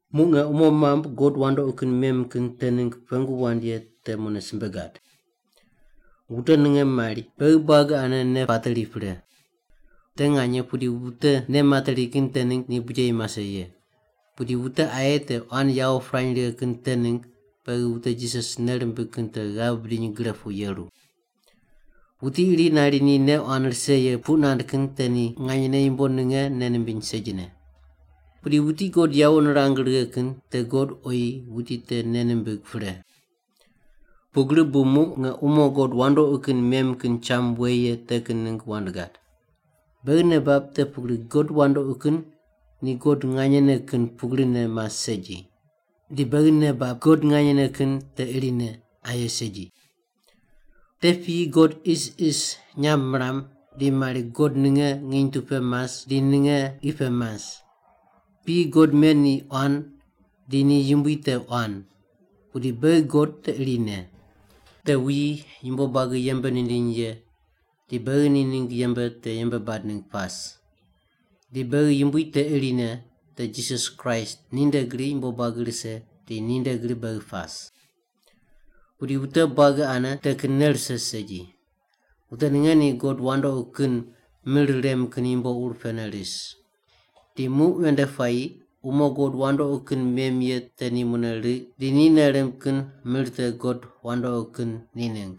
Muq nge umo mambui god wandoqi kin mem kin te ningg pengu wand ye te mune simbe gad. Wute ninge mari, “Beghi buagi ane nei pateri pre.” Te nganye pudi wute nei materi kin te ningg ni bujeyi mase ye. Pudi wute aye te quan yawo pirany righe kin te ningg beghi wute Jisas nei rimbig kin te ghav bidiny gre pu yeru. Wuti iri nari ni nei quan rise ye puq nand kin te ni nganyene yumbo ninge nei nimbiny segine. Pudi wuti God yawo nirang righe kin te God oyi wuti te nei nimbig pre. Pugri bu muq nge umo god wandoqi kin mem kin cham we ye te kin ningg wand gad. Beghi nei bab te pugri god wandoqi kin ni God nganyene kin pugrine mas segi, di beghi nei bab God nganyene kin te irine, aye segi. Te piyi god isis nyamb miram di mari god ninge nginy tu pe mas di ninge qi pe mas. Piyi god men ni quan di ni yumbui te quan, pudi beghi God te irine. Te wuyi yumbo buagi yembe nindiny ye di beghi ni ningg yembe te yembe bad ningg pas. Di beghi Yumbui te irine, te Jisas Kraist, ninde gri yumbo buagi rise di ninde gri beghi pas. Pudi wute buagi ane te kin nei rise segi. Wute ninge ni god wandoqi kin mir rem kin yumbo ur pene ris. Di muq ven nde puayi umo god wandoqi kin mem ye te ni mune riq di ni nei rimb kin mir te god wandoqi kin ni ningg.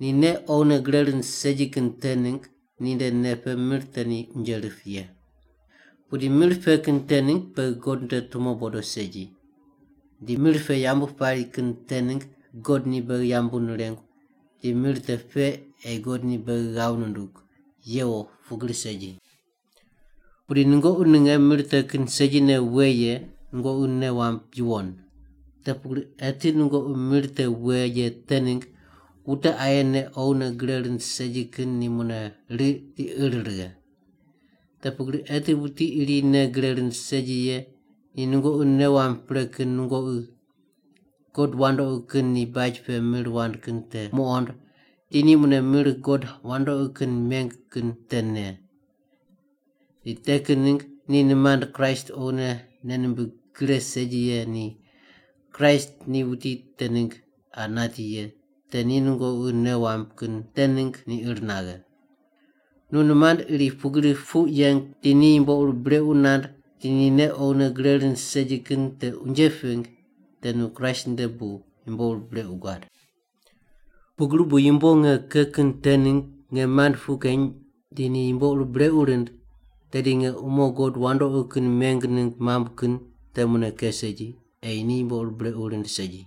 Ni nei oghine gre rind segi kin te ningg ninde nei pe mir te ni unje rip ye. Pudi mir pe kin te ningg beghi God nde tumo bodo segi. Di mir pe yambu pari kin te ningg God ni beghi yambu nirengu, di mir te pe ei God ni beghi ghav nundug, yewo pugri segi. Pudi nungoqi ninge mir te kin segine we ye nungoqi nei wamb yuwon. Te pugri eti nungoqi mir te we ye te ningg wute aye nei oghine gre rind segi kin ni mune riq di ir righe. Te pugri eti wuti iri nei gre rind segi ye ni nungoqi nei wamb pre kin nungoqi god wandoqi kin ni baj pe mir wand kin te nuqond di ni mune mir god wandoqi kin meng kin te ne. Di te kin ningg nu nimand Kraist oghine nei nimbig gre segi ye di Kraist ni wuti te ningg qa nati ye te ni nungoqi nei wamb kin te ningg ni ir naghe. Nu nimand iri pugri puq yeng di ni yumbo ur brequ nand di ni nei oghine gre rind segi kin te unje ping te nu Kraist nde bu yumbo ur brequ guad. Pugri bu yumbo nge ke kin te ningg nge mand puq keny di ni yumbo ur brequ rind, tedi nge umo god wandoqi kin meng ningg mambui kin te mune ke segi, ei ni yumbo ur brequ rind segi.